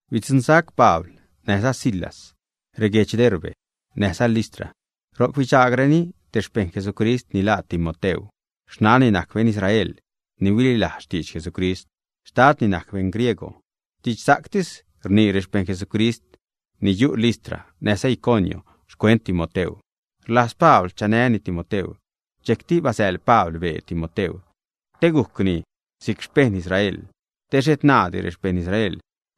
Bidzuṉsac Pabl näjza Silas reguedx Derbe näjza Listra. Ro'c bidxaagreni te xpeṉ Jesucrist ni laa Timoteu. Xnanni najc beṉ Israel ni huililajz xtidx Jesucrist. Xtadni najc beṉ griegw. Didxsa'ctis rnii rexpeṉ Jesucrist ni yu' Listra näjza Iconio xcuent Timoteu. Rlajz Pabl chanäni Timoteu. Dxejcti basäḻ Pabl bee Timoteu te gujcni si'c xpeṉ Israel, te xhet naadi rexpejṉ Israel,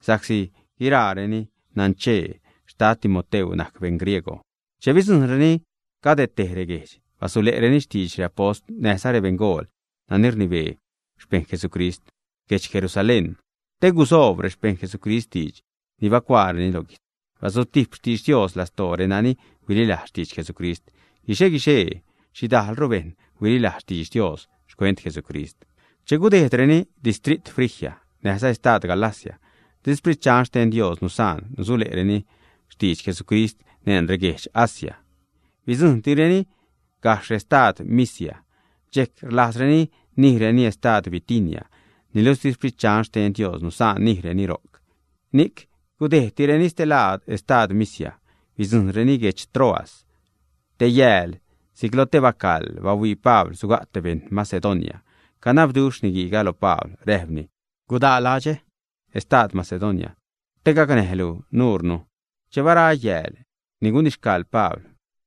sa'csi guiraareni nanchee xtad Timoteu najc beṉ griegw. Che bidzujṉreni cade tej reguejdx, basule'reni xtidx reapost näjza rebeṉgool nani rnibee xpeṉ Jesucrist guedx Jeurusalén, te gusoob rexpejṉ Jesucrist diidx ni bacuaareni lo guijtz. Bazutijp xtidx Dios lastoo renani huililajz xtidx Jesucrist. Guixe-guixee xhidajlru bejṉ huililajz xtidx Dios xcuent Jesucrist. Che gudejdreni distrit Frigia, näjza estad Galacia, di Sprit Dxan xten Dios nusaan nusule'reni xtidx Jesucrist neṉ reguedx Asia. Bidzujṉtireni gajxh estad Misia. Dxejc rlajzreni nijreni estad Bitinia, niluxh di Sprit Dxan xten Dios nusaan nijreni ro'c. Ni'c gudejdtireni stelaad estad Misia, bidzujṉreni guedx Troas. Te yääl si'c lo te bacaḻ bahuii Pabl suga' te beṉ Macedonia. Canabduxh niguiiga lo Pabl, räjpni: ―Gudaa ladxä, estad Macedonia, te gacnäjlu nuunu. Che bara yääl ni gunixcaḻ Pabl,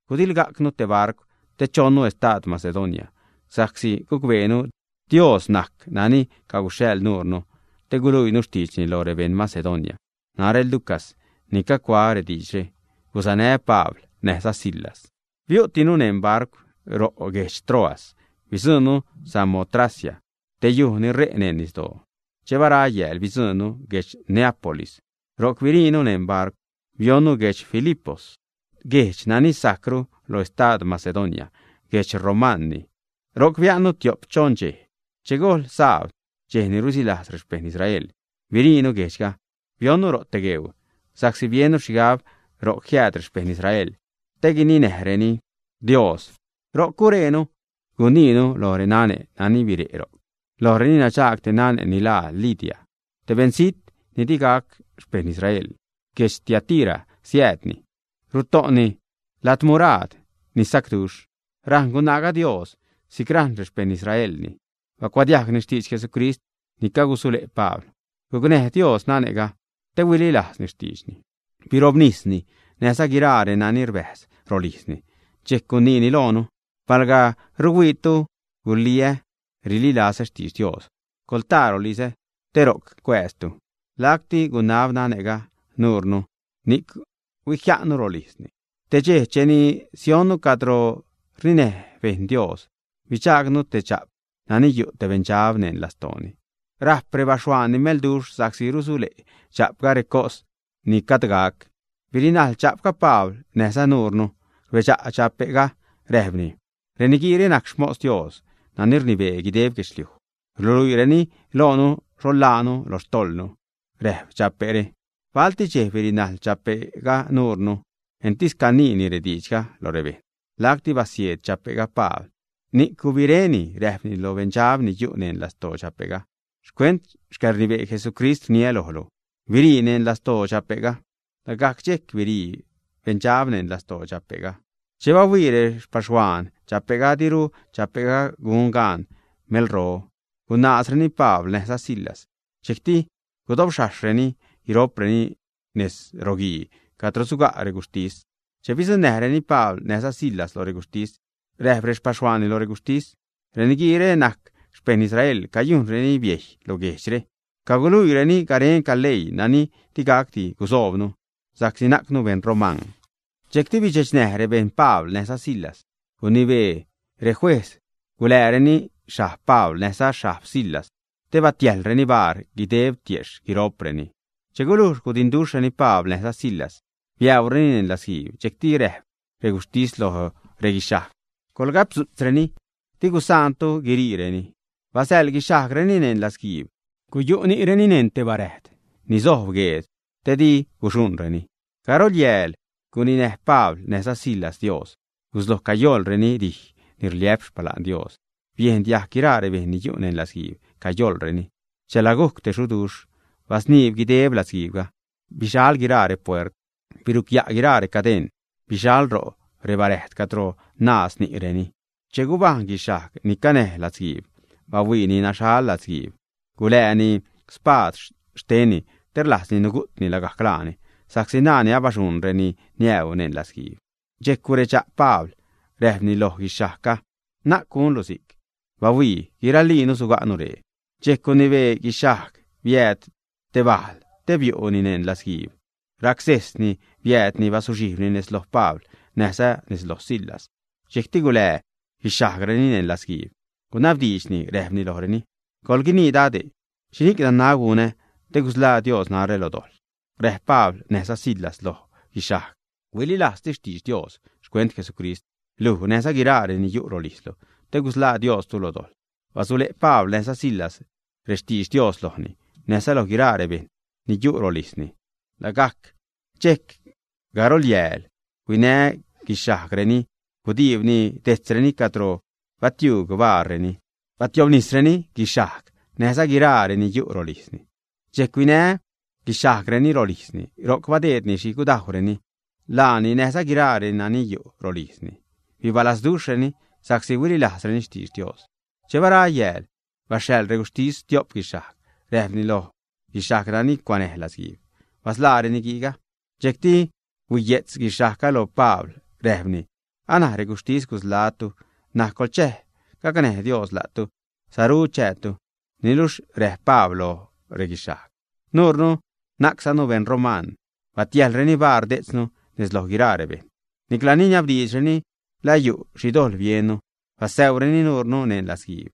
gudilgajcnu te barcw te chonnu estad Macedonia, sa'csi gucbeenu Dios najc nani caguxhaḻ nuure te guluiini xtiidxni lo rebeṉ Macedonia. Narä, Lucas, ni cagucuaä rediidxre, gusanää Pabl näjza Silas. Biu'tinu neṉ barcw ro' guedx Troas. Bidzuṉnu Samotracia, te yuj ni ṟe' neṉ nisdoo. Che bara yääl bidzuṉnu guedx Neápolis. Ro'c biriinu neṉ barcw, bionnu guedx Filipos, guejdx nani sajcru lo estad Macedonia. Guedx romanni. Ro'c bia'nnu tiop choṉ dxej. Che gojl sabd, dxej ni rusilajz rexpejṉ Israel, biriinu guejdxga bionnu ro' te gueuu, sa'csi biennu xhigab ro'c jiääd rexpejṉ Israel te guininäjreni Dios. Ro'c gurejnu, guniinu lo renane' nani bire' ro'c. Lojreni nadxaag te nane' ni laa Lidia, te beṉzijt ni digac xpejṉ Israel. Guedx Tiatira siäädni. Ruto'ni ladmuraad ni sacduxh. Rajṉ gunaaga Dios si'c rajṉ rexpejṉ Israelni. Bacuadiajgni xtidx Jesucrist ni cagusule' Pabl. Gucnäj Dios nane'ga te huililajzni xtiidxni. Birobnisni, näjza guiraa reni rbäjz rolijzni. Dxejc guniini loonu: ―Palga ruhuiitu guliä rililazä xtidx Dios, coḻtaa rolizä te ro'c cuääztu. Lacti gunab nane'ga nuunu, ni'c huijia'nnu rolijzni. Te dxej cheni sionnu cadro rninäj bejṉ Dios, bidxaagnu te dxa'p nani yu' te beṉdxab neṉ lastooni. Rajp rexpaxhuaanni melduxh sa'csi rusule' dxa'pga recos ni gajd gac. Birinajl dxa'pga Pabl näjza nuure. Rbedxa' dxape'ga, räjpni: ―Reniguiire najc xmos Dios nani rnibee guideb guedxliuj. Ruluiireni loonu xho ḻaanu lo xtojḻnu ―räjp dxape're. Balti dxej birinajl dxape'ga nuure, entis caniini rediidxga lo rebejṉ. Lacti basieed dxape'ga Pabl, ni'c gubiréni, räjpni lo beṉdxab ni yu' neṉ lastoo dxape'ga: ―Xcuent xcäḻrnibee Jesucrist rniä lojlu: “Birii neṉ lastoo dxape'ga.” Lagajc dxejc birii beṉdxab neṉ lastoo dxape'ga. Che bahuii rexpaxhuaan dxape'ga diru dxape'ga gun gaan melro, gunaazreni Pabl näjza Silas. Dxejcti gudobxhajxhreni guiro'preni nez roguii cadro suga' reguxhtis. Che bidzuṉnäjreni Pabl näjza Silas lo reguxhtis, räjp rexpaxhuaanni lo reguxhtis: ―Reniguiire najc xpejṉ Israel. Cayujnreni biejy lo guejdxre. Caguluiireni garenca leii nani digacdi gusoobnu sa'csi najcnu beṉ roman. Dxejcti bidxechnäj rebejṉ Pabl näjza Silas. Gunibee rejuejz gulääreni xhajb Pabl, näjza xhajb Silas, te batiäjḻreni baar guideb tiejxh guiro'preni. Che gulujx gudinduxhreni Pabl näjza Silas, biäureni neṉ latzguiib. Dxejcti räjp reguxhtis lo reguixhajg: ―Coḻgapdzu'tzreni, di gusaantu guiriireni. Basäḻ guixhajgreni neṉ latzguiib. Guyu' ni'reni neṉ te baräjd ni sojb gueed te di guxuṉreni. Garolyääl guninäj Pabl näjza Silas Dios, gusloj cayoḻreni dij ni rliä'p xpala'n Dios. Biejn diajg guiraa rebejṉ ni yu' neṉ latzguiib cayoḻreni. Chela gujc te xuduxh, basniib guideb latzguiibga. Bixal guiraa repuert, birucya' guiraa recadeṉ, bixal ro' rebaräjd cadro naaz ni'reni. Che gubajṉ guixhajg ni canäj latzguiib, bahuiini naxhal latzguiib, gulääni spaad xtenni, te rlajzni nugu'tni lagajc laani, sa'csi naani abadxuṉ reni niäu neṉ latzguiib. Dxejc guredxa' Pabl, räjpni lo guixhajgga: ―Na'c gunlu si'c. Bahuii, guiraliinu suga'nu ree. Dxejc gunibee guixhajg biääd te bajl te biu'ni neṉ latzguiib. Racsejsni biäädni bazuxhijbni nez loj Pabl näjza nez loj Silas. Dxejcti gulää guixhajgreni neṉ latzguiib. Gunabdiidxni räjpni lojreni: ―¡Coḻguinii, dade'! ¿Xhini'c nanab gunä te gusḻaa Dios narä lo dojḻ? Räjp Pabl näjza Silas lo guixhajg: ―Huililajztis xtidx Dios xcuent Jesucrist, luj näjza guiraa reni yu' rolijzlu, te gusḻaa Diostu lo dojḻ. Basule' Pabl näjza Silas rextidx Dios lojni näjza loj guiraa rebejṉ ni yu' rolijzni. Lagajc dxejc, garol yääl, huinä guixhajgreni gudiibni dejtzreni cadro batiuug baarreni. Dxejcti batiobnisreni guixhajg näjza guiraa reni yu' rolijzni. Dxejc huinä guixhajgreni rolijzni, ro'c badeedni xhi gudajwreni. Laani näjza guiraa reni yu' rolijzni bibalazduxhreni sa'csi huililajzreni xtidx Dios. Che bara yääl, baxhaḻ reguxhtis stiop guixhajg räjpni lo guixhajg nani cuanäj latzguiib: ―Basḻaa reniguiiga. Dxejcti huiye'tz guixhajgga lo Pabl, räjpni: ―Anaj reguxhtis gusḻaä́tu. N̲aj coḻchäj, gacnäj Dios la'tu, saru chäätu. Niluxh räjp Pabl loj reguixhajg: ―Nuure najczanu beṉ roman. Batiäjḻreni baar detznu nez loj guiraa rebejṉ. Nicla niniabdiidxreni la yu' xhi dojḻ biennu. Basäureni nuure neṉ latzguiib.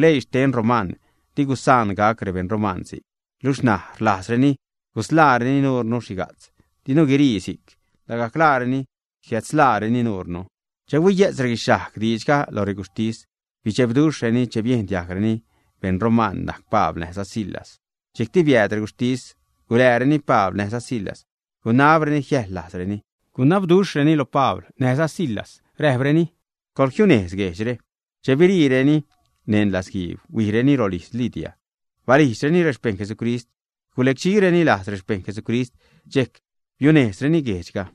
Leii xten roman di gusaan gac rebeṉ roman si'c. Luxh ṉaj rlajzreni gusḻaareni nuure xhiga'tz. ¡Dinu guirii si'c! Lagajc laareni sujiädsḻääreni nuunu. Che huiye'tz reguixhajg diidxga lo reguxhtis, bidxebduxhreni che biejn diajgreni beṉ roman najc Pabl näjza Silas. Dxejcti biääd reguxhtis, gulääreni Pabl näjza Silas, gunabreni jiäjḻlajzreni. Gunabduxhreni lo Pabl näjza Silas; räjpreni: ―Coḻjiunejz guejdxre. Che biriireni neṉ latzguiib, huijreni rolijz Lidia. Balijdxreni rexpejṉ Jesucrist, gulecdxireni lajz rexpejṉ Jesucrist. Dxejc biunejzreni guejdxga.